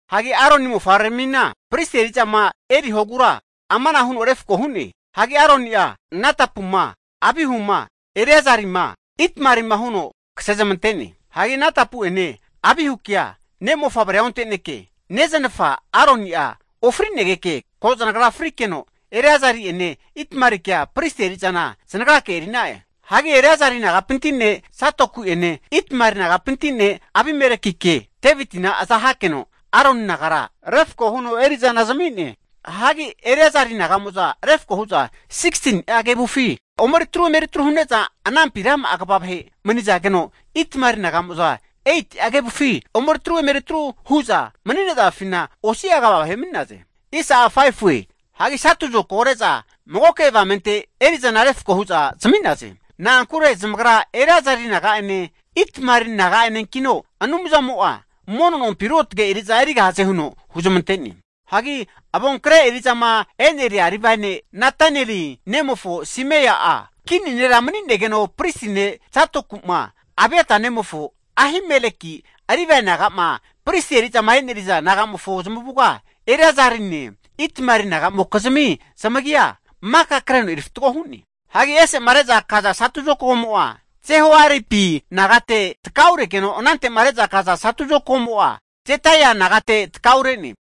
Hagi Aroni mofavreramina, pristi eri'zama erihogura amana huno refko hu'ne. Hagi Aroni'a Nadapuma, Abihuma, Eleazarima Itamarima huno kasezmante'ne. Hianagi Nadapu'ene Abihukea ne' mofavrea onte'neke, neznafa Aroni'a ofrinegeka ko zanagra frikeno, Eleazari'ene Itamarike pristi eri'zana zanagrake eri'na'e. Hagi Eleazari nagapinti ne' Zadoki'ene Itamari nagapinti ne' Abimelekike Devitina aza hakeno, Aroni nagara refko huno eri'zana zami'ne. Hagi Eleazari naga'mo'za refko hu'za 16ni'a kevufi omeri atru emeri atru hu'ne'za anampina rama'a kva vahe manizageno, Itamari naga'mo'za 8'a kevufi omeri atru emeri atru hu'za mani'nazafina osi'a kva vahe mani'naze. Hagi satu zokago re'za magoke avamente eri'zana refko hu'za zami'naze. Na'ankure zamagra Eleazeri naga'ene Itamari naga'enenkino Anumzamo'a mono nompi ruotge eri'za erigahaze huno huzmante'ne. Hagi avonkre eri'zama eneria Livae ne' Netaneli nemofo Semaia kini ne'mofo avonkre eri'za vahera mani'negeno, pristi ne' Zadoku'ma Abiatar nemofo Ahimeleki Livae naga'ma pristi eri'zama eneriza naga'mofo zamavuga Eliezarine Itamali nagamokizmi zamagia maka kreno erifatgo hu'ne. Hagi ese'ma reza kaza satu zokagomo'a Jehoiaribi nagate takauregeno anante'ma reza kaza satu zokagomo'a Jedaia nagate takaure'ne.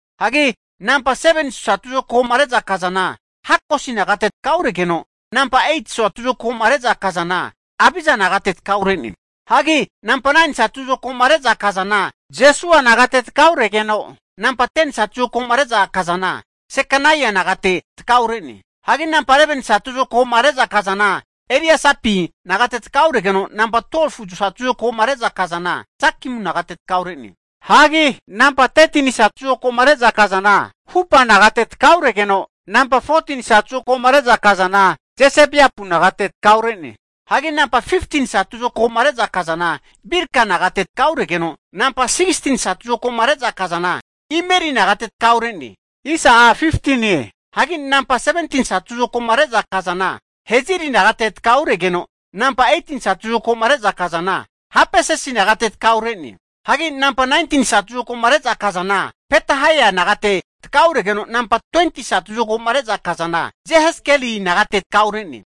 Hagi namba 7ni satu zokagoma re'za kazana Hakosi nagate takauregeno, namba 8ti satu zokagoma re'za kazana Abiza nagate takaure'ne. Hagi namba 9ni satu zokagoma re'za kazana Jesua nagate takauregeno, namba 10ni satu zokagoma re'za kazana Sekania nagate takaure'ne. Hagi namba 11ni satu zokagoma reza kazana Eliasipi nagate takauregeno, namba 12fu satu zokagoma re'za kazana, Jakimu nagate takaure'ne. Hagi namba 13ni satu zokagoma re'za kazana, Hupa nagate takauregeno, namba 14ni satu zokagoma re'za kazana Jesebeapu nagate takaure'ne. Hagi namba 15ni satu zokagoma re'za kazana Bilga nagate takauregeno, namba 16ni satu zokagoma re'za kazana Imeri nagate takaure'ne. Hagi namba 17ni satu zokagoma re'za kazana Heziri nagate takauregeno, namba 18ni satu zokagoma re'za kazana Hapisesi nagate takaure'ne. Hagi namba 19ni satu zokagoma re'za kazana Petahaia nagate takauregeno, namba 20ti satu zokagoma re'za kazana Jehezkeli nagate takaure'ne.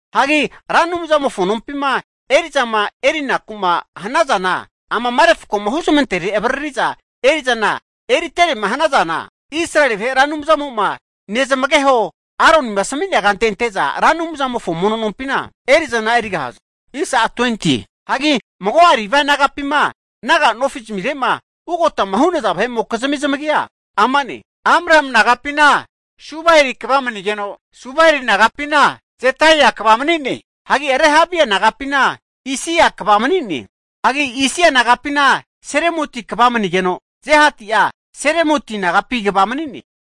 Hagi Ra Anumzamofo nompima eri'zama erinaku'ma hanazana amama refkoma huzmantere avariri'za eri'zana emeriterema hanazana, Israeli vahe Ra Anumzamo'ma nezamageho Aronima asami'nea kante ante'za Ra Anumzamofo mono nompina eri'zana erigahaze. Hagi mago'a Livae nagapima naga nofizamirema ugota hu'naza vahe'mokizmi zamagia ama'ne, Amrami nagapina Subaeli kva manigeno, Subaeli nagapina Jedeia kva mani'ne. Hagi Rehabia nagapina Isia kva mani'ne. Hagi Isia nagapina Selomoti kva manigeno, Johati'a Selomoti nagapi kva mani'ne.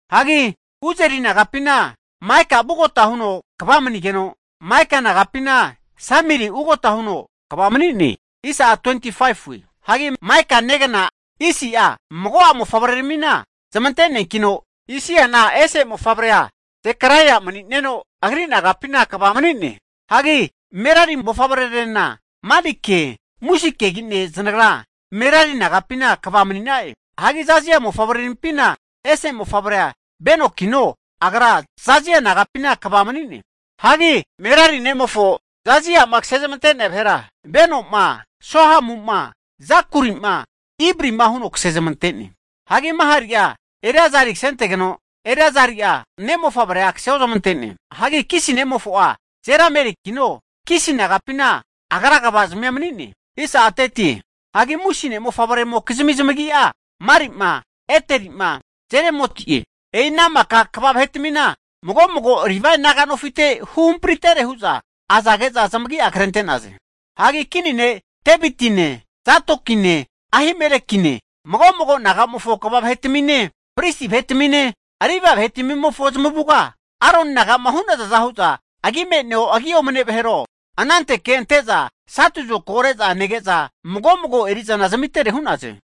Hagi Uzieli nagapina Maika ugota huno kva manigeno, Maika nagapina Samiri ugota huno kva mani'ne. Hagi Maika negna Isia'a mago'a mofavreramina zamante'neankino, Isiana ese mofavre'a Zekaraia mani'neno, agri nagapina kva mani'ne. Hagi Merari mofavrerarena Malike, Musikegine zanagra Merari nagapina kva mani'na'e. Hagi Jazia mofavreramimpina ese mofavrea Benokino, agra Jazia nagapina kva mani'ne. Hagi Merari nemofo Jazia'ma kasezmante'nea vahera, Benoma, Sohamuma, Zakurima, Ibrima huno kasezmante'ne. Hagi Mahali'a Eleazari kasentegeno, Eleazari'a ne' mofavrea kaseozmante'ne. Hagi Kisi nemofo'a Jeramelikino, Kisi nagapina agra kvazmia mani'ne. Hagi Musi ne'mofavre'mokizimi zamagi'a Mali'ma, Ederi'ma Jerimoti'e. E'i ana maka kva vahetmina mago mago Livae naga nofite huhampritere hu'za azage'za zamagia krente'naze. Hagi kini ne' Devitine, Zadokine, Ahimelekine, mago mago nagamofo kva vahetamine, pristi vahetamine, Livae vahetamimofo zamavuga, Aroni naga'ma hu'nazaza hu'za agi me'neo agi omane vahero anankanteke ante'za satu zokago re'za nege'za, mago mago eri'zana zamitere hu'naze.